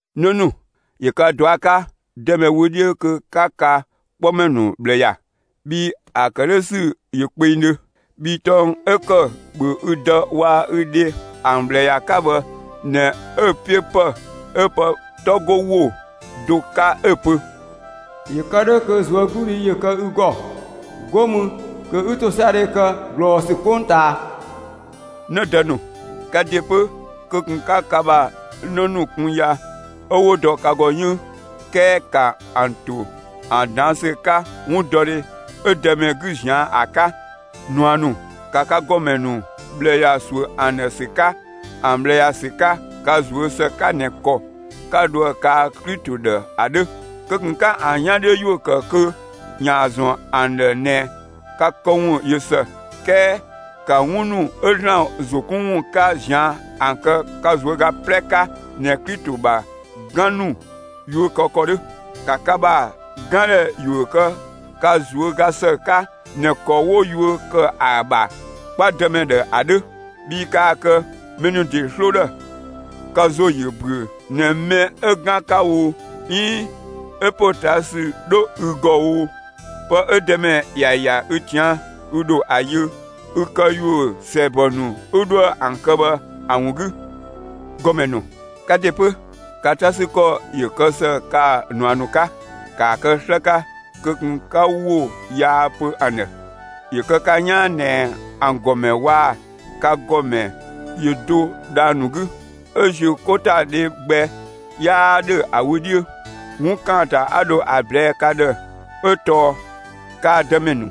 'Në ‑nu, ‑yö ka ꞊dua' 'ka Dëmɛ wö 'dhiö kö 'ka ka 'kpɔmɛ ‑nu ꞊bhlë ‑ya, bhii ‑a ‑kë 'dhö ‑sü ‑yö kpengdhö. Bhii tɔng 'ö ‑kë ‑bhö ü dë waa‑ ü dhe ‑an ꞊bhlë ‑ya 'ka bhë ꞊nɛ 'ö‑ 'piö ‑pë 'ö pë 'tɔ 'go ‑wo do 'ka 'ö‑ pö: ‑Yö kë 'dhö kö ꞊zuögludhi ‑yö kë ü ‑gɔ, 'go mü kö 'ü ‑tosiadhe kë ꞊glɔɔsü 'kpongtaa. 'Në dë ‑nu, ka ‑de 'pö, kö ꞊kun 'ka ka ‑bha 'në ‑nu kun ya 'ö 'wo dɔ ka ‑gɔ 'yënng. 'Kɛɛ ‑ka ‑an ‑to ‑an ꞊daan' ‑sü 'ka 'wundɔdhe 'ö Dëmɛ 'gü ꞊zian' ‑a 'ka! ꞊Nua ‑nu, ‑ka ka ‑gɔmɛ ‑nu ꞊bhlë ‑ya ‑suö ‑an ‑dhë ‑sü 'ka ka ꞊zuö' ‑së 'ka ꞊nɛ ‑kɔ 'ka dhoë kaa Klito ‑dhë ‑a 'dhö. Kö ꞊kun 'ka ‑an 'yan 'dhiö ‑yuö ‑kë kö ‑yaan ‑zɔn ‑an ‑dhë ꞊nɛ ka këwun ꞊yö ‑së; 'kɛɛ ‑ka 'wun ‑nu 'ö ‑Zlan ‑zo 'kun ‑wun 'ka ꞊zian' ‑an kë ka ꞊zuöga 'plɛ 'ka ꞊nɛ Klito ‑bha 'gan ‑nu yuö kë ‑kɔ 'dhö. ‑Ka ka ‑bha 'gandhɛ ‑yuö kë ka ꞊zuöga ‑së 'ka ꞊nɛ ‑kɔ 'wo yuö ‑kë ‑a ‑bha 'kpa Dëmɛ ‑dhë ‑a 'dhö; bhii kaa‑ kë mɛ ‑nu ‑de 'sloo ‑dhë! Ka ‑zo ‑yö ‑büö ꞊nɛ, mɛ 'ü 'gan 'ka oo, 'iin 'ö ‑potaasü 'dhö ü ‑gɔ oo, pë 'ö Dëmɛ ‑ya ‑ya ü ꞊tian', ü ‑dho ‑a yö, ü këyuö ‑sɛɛbɔ ‑nu 'ü 'dhoë‑ ‑an kë bhë ‑a ‑wun 'gü. ‑Gɔmɛ ‑nu, ka ‑de 'pö, ka 'ta 'sü ‑kɔ ‑yö kë ‑së kaa‑ ꞊nua ‑nu 'ka; ‑kaa kë 'slë 'ka kö ꞊kun 'ka ‑wo yaa pö ‑an ‑dhë; ‑yö kë ka 'yaan ꞊nɛ ‑an ‑gɔmɛ waa‑ ka ‑gɔmɛ ‑yö do dhang‑ ‑nu 'gü; 'ö ‑ziö 'ko ‑ta dhe gbɛ 'yaa ‑dhö ‑a wö 'dhiö. 'Wun ‑kaanta 'a dho ‑a ꞊blɛɛ' ka ‑dhë 'ö tɔɔ kaa‑ Dëmɛ ‑nu,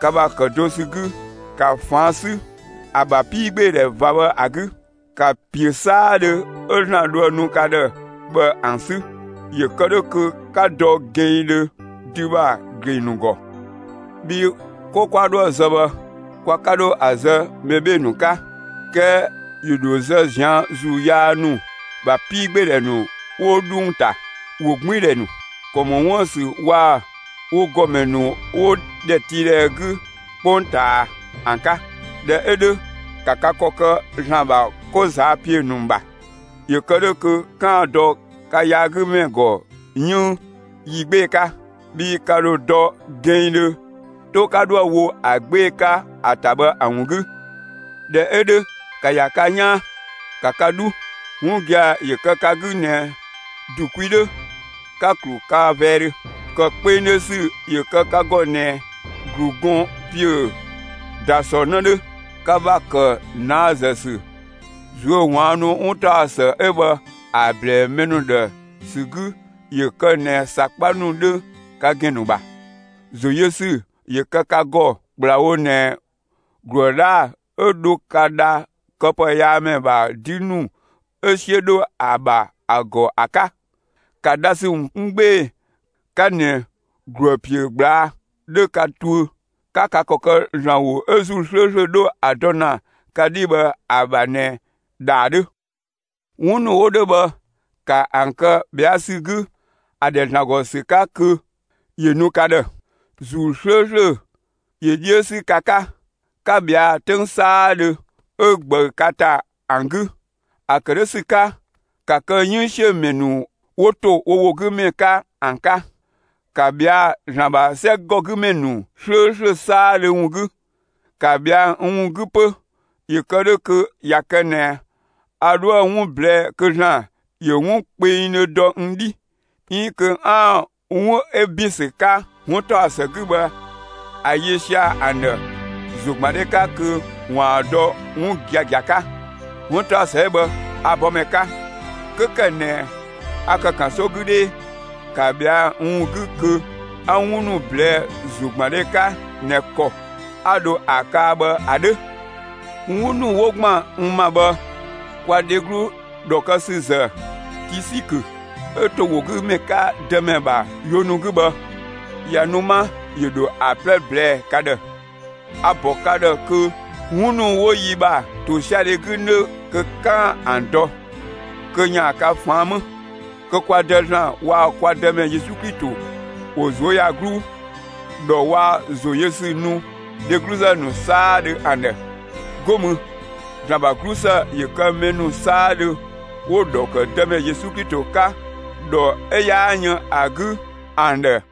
ka ‑bha ‑kë do ‑sü 'gü, ‑ka ꞊faan' 'sü ‑a ‑bha 'piigbeedhɛ ꞊va bhë ‑a 'gü! ‑Ka ‑piö 'saadhö 'ö ‑Zlan 'dhoë‑ nu ‑na ka ‑dhë bhë ‑an 'sü, ‑yö kë 'dhö kö 'ka dɔ gɛnngdhö dü ‑bha ‑gleng ‑nu ‑gɔ! Bhii 'ko 'kwa 'dhoë‑ zë bhë, kwa 'ka 'dho ‑a zë mɛ 'bhee‑ ‑nu 'ka; 'kɛɛ ‑yö ‑dho zë ꞊zian' ‑zuu yaa ‑nu ‑bha 'piigbeedhɛ ‑nu 'wo 'dhung‑ ‑ta, ‑wogbiindhɛ ‑nu, ‑kɔ ‑mɔ 'wuën‑ ‑sü waa‑ wo ‑gɔmɛ ‑nu 'wo ‑dhɛtiidhɛ 'gü 'kpongtaa ‑an 'ka. ꞊Dhɛ 'ö 'dhö ‑ka ka ‑kɔ kë ‑Zlan ‑bha 'ko ꞊zaa' ‑piö ‑nu ‑bha! ‑Yö kë 'dhö kö 'kaan‑ dɔ ka yaagümɛ ‑gɔ 'yënng yi 'gbee‑ 'ka; bhii ka ‑dho dɔ gɛnngdhö 'to 'ka 'dhoë‑ wo ‑a 'gbee‑ 'ka ‑a ‑ta bhë ‑a ‑wun 'gü. ꞊Dhɛ 'ö 'dhö ‑ka ‑ya ka 'yaan; ‑ka ka 'dhu: 'Wun gia‑ ‑yö kë ka 'gü ꞊nɛ ‑du kwi 'dhö, 'ka‑ ‑klu ka vɛɛdhö, ‑kë kpengdhö ‑sü ‑yö kë ka ‑gɔ ꞊nɛ ‑glu gɔn ‑piö ‑da ‑sɔ 'në 'dhö! Ka ‑bha ‑kë ꞊naazë ‑sü, ꞊zuöwaannu ‑wuntaɔsë 'ö bhë ‑a ꞊blɛɛ'‑ mɛ ‑nu ‑dhë ‑sü 'gü ‑yö kë ꞊nɛ ‑sakpa ‑nu 'dhö ka ‑gɛn ‑nu ‑bha! ‑Zo yö ‑sü ‑yö kë ka ‑gɔ ‑kplawo ꞊nɛ ‑gluë 'dhaa‑ 'ö dho ka dha këpëyaamɛ ‑bha 'dü ‑nu 'ö 'siö 'dho ‑a ‑bha ‑a ‑gɔ ‑a 'ka. ‑Ka dhasü ‑wun 'kun 'gbee‑ 'ka ꞊nɛ ‑gluë ‑piö ꞊gblaa' 'dhö ka tuö; 'ka ka ‑kɔ kë ‑Zlan ‑wo 'ö ‑Zuu 'slööslö 'dho ‑a dɔ ‑na ka 'dhi bhë ‑a ‑bha ꞊nɛ ‑dhaa 'dhö. 'Wun ‑nu 'wo 'dhö bhë ‑ka ‑an kë ꞊bhɛa' ‑sü 'gü ‑a ‑dhɛ ‑Zlan ‑gɔ ‑sü 'ka kö ‑yö nu ka ‑dhë; ‑Zuu 'slööslö ‑yö 'dhiö 'sü ka 'ka, 'ka ꞊bhɛa'‑ 'töng 'saadhö 'ö ꞊gbëü ka ‑ta ‑an 'gü! ‑A ‑kë 'dhö ‑sü 'ka, ‑ka kë 'yënngsiömɛ ‑nu 'wo ‑to wo ‑wo 'gü ‑mɛ 'ka ‑an 'ka! ‑Ka ꞊bhɛa'‑ ‑Zlan ‑bha 'sɛgɔgümɛ ‑nu 'slööslö 'saadhö ‑wun 'gü! ‑Ka ꞊bhɛa'‑ n ‑wun 'gü 'pö, ‑yö kë 'dhö kö ꞊ya kë ꞊nɛ a 'dhoë‑ 'wun ꞊blɛɛ'‑ kö ‑Zlan ‑yö 'wun kpengdhö dɔ n 'dhi, 'iin kö 'aan‑ 'wun 'ö ‑bin ‑sü 'ka 'wuntaɔsë 'gü bhë ‑a yö sia‑ ‑an ‑dhë ‑zogbandhe 'ka kö ‑waan dɔ 'wun giagia 'ka. 'Wuntaɔsë 'ö bhë, a‑ bɔmɛ 'ka, 'kö ‑kë ꞊nɛ a ‑kë ‑kanso 'gü 'dhee; ‑ka ꞊bhɛa'‑ n ‑wun 'gü kö 'a 'wun ‑nu ꞊blɛɛ'‑ ‑zogbandhe 'ka ꞊nɛ ‑kɔ 'a dho ‑a kaa bhë ‑a 'dhö. 'Wun ‑nu 'wo ‑gban n ‑ma bhë kwa dheglu ‑dhɔ kë ‑sü ‑zë Tisikö 'ö ‑to ‑wo 'gü ‑mɛ 'ka Dëmɛ ‑bha yuö ‑nu 'gü bhë, ꞊ya nu 'ma, ‑yö ‑dho ‑a 'plɛ ꞊blɛɛ'‑ ka ‑dhë. A‑ ‑bɔ ka ‑dhë kö 'wun ‑nu 'wo yi ‑bha ‑tosiadhe 'gü 'nö kö 'kaan‑ ‑an dɔ, kö ‑yaan ka ꞊faan' 'më. Kö kwa Dë ‑Zlan waa‑ kwa Dëmɛ Yesu Klito ‑wo ꞊zuöyagluu, ‑dhɔ waa‑ ‑zo yö ‑sü nu dhegluzë ‑nu 'saadhö ‑an ‑dhë. 'Go mü ‑Zlan ‑bha 'glusë ‑yö kë mɛ ‑nu 'saadhö 'wo‑ ‑dhɔ ‑kë Dëmɛ Yesu Klito 'ka ‑dhɔ 'ö 'yaa yën ‑a 'gü ‑an ‑dhë!